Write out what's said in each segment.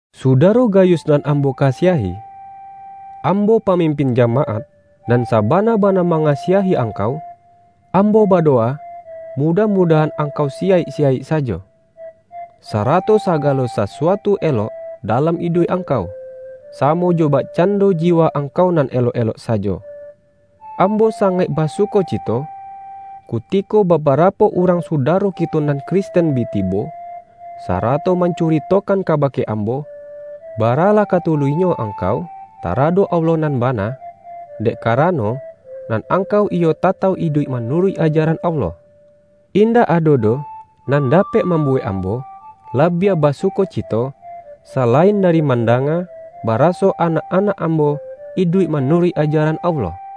Sudaro Gayus nan ambo ka- siahi! Ambo, pamimpin jamaat, nan sa-bana-bana mangasiahi angkau, am-bo badowa, mudah-mudahan angkau siyaik-siyaik sajo, sarato sagalo sasu-atu elok dalam iduik angkau, samo jo bakcando jiwa angkau nan elok-elok sajo. Ambo sangaik basuko-cito, kutiko babarapo urang suda-ro kito nan Kristen bi tibo, sarato mancuritokan kabake ambo, bara-lah ka tuluihnyo angkau taradok Allah nan bana, dek karano, nan angkau iyo tatauk iduik manuruik ajaran Allah. Indak ado doh nan dapek mambuwek ambo labiah ba-sukocito, salain dari mandanga, ba-raso anak-anak ambo iduik manu-ruik ajaran Allah.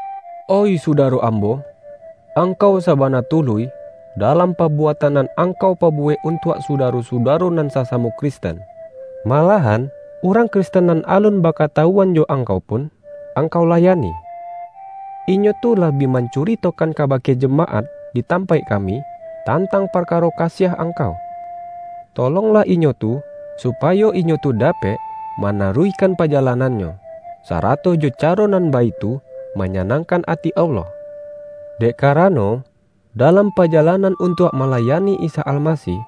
Oih sudaro ambo! Angkau sa-bana tuluih, dalam pabuatan nan angkau pabuwek untuak sudaro-su-daro nan sasamo Kristen; malahan, urang Kristen nan alun bakatawu-an jo angkau pun, angkau layani. Inyo tu lah bi mancuritokan kaba-ke jamaat di tampaik kami, tantang parkaro kasiah angkau. Tolonglah inyo tu, supayo inyo tu dapek ma-naruihkan pajalanannyo, sarato jo caro nan baitu manyanangkan ati Allah, dek karano, dalam pajalan-an untuak malayani Isa Almasih,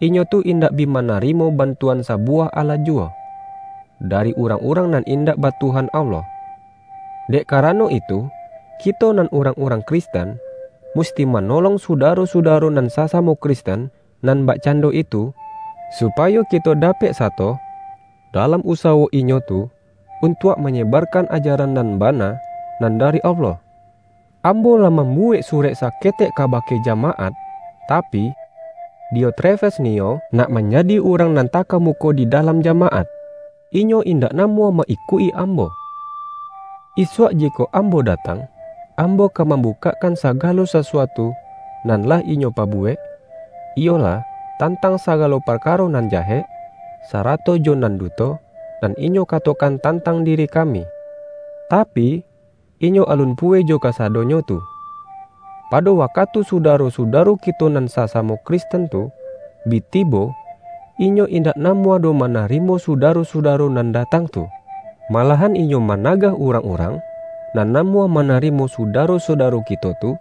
inyo tu indak bi manarimo bantu-an sabuwah alah juwo, dari urang-urang nan indak ba Tuhan Allah. Dek karano itu, kito nan urangurang Kristen, musti manolong su-daro-sudaro nan sasamo Kristen nan bakcando itu, supayo kito da-pek sato dalam usawo inyo tu, un-tuak manyebarkan ajaran nan bana nan dari Allah. Ambo lah mambuwek surek sa-ketek kabake jamaat, tapi, Diotrefes niyo nak manjadi urang nan taka-muko di dalam jamaat, inyo indak namuah ma-ikuik-i ambo. Isuak jikok ambo datang, ambo ka mam-bukakkan sagalo sasuatu nan lah inyo pabuwek, iyolah, tantang sa-galo parkaro nan jahek, sarato jo nan duto, nan inyo katokan tantang diri kami! Tapi, inyo alun puweh jo kasadonyo tu. Pado wakatu suda-ro-sudaro kito nan sasamo Kristen tu, bi tibo, inyo indak namuah doh manarimo sudaro-sudaro nan datang tu. Malahan inyo managah urang-urang nan namuah manarimo su-daro-sudaro kito tu,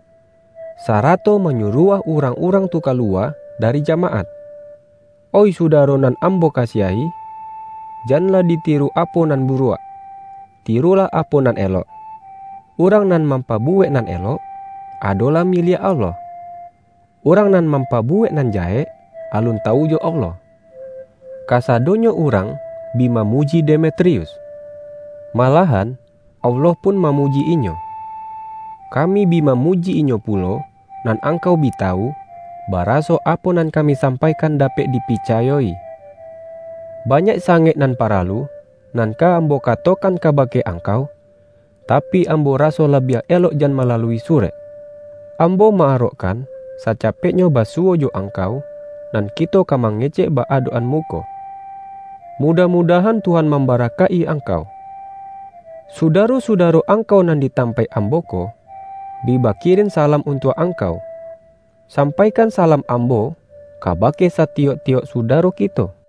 sarato manyu-ruah urang-urang tu kaluwa dari jamaat! Oih sudaro nan ambo kasiahi, janlah ditiru apo nan buruak. Ti-rulah apo nan elok. Urang nan mampabuwek nan elok, adolah miliak Allah. Urang nan mam-pabuwek nan jahek, alun tawu jo Allah. Kasadonyo urang bi mamuji De-metrius. Malahan Allah pun mamu-ji inyo. Kami bi mamuji inyo pu-lo, nan angkau bi tawu, baraso apo nan kami sampaikan dapek dipi-cayo-i. Banyak sangaik nan paralu, nan ka ambo katokan kabake angkau, ta-pi, ambo raso labiah elok jan malalui surek. Ambo ma-arokkan sacapeknyo basuwo jo angkau, nan kito ka mangecek ba-adok-an muko. Mudah-mudahan Tuhan mamba-rakaik-i angkau. Sudaro-sudaro angkau nan di tam-paik ambo ko, bi bakirin salam un-tuak angkau. Sampaikan salam ambo kabake satiyok-tiyok sudaro kito.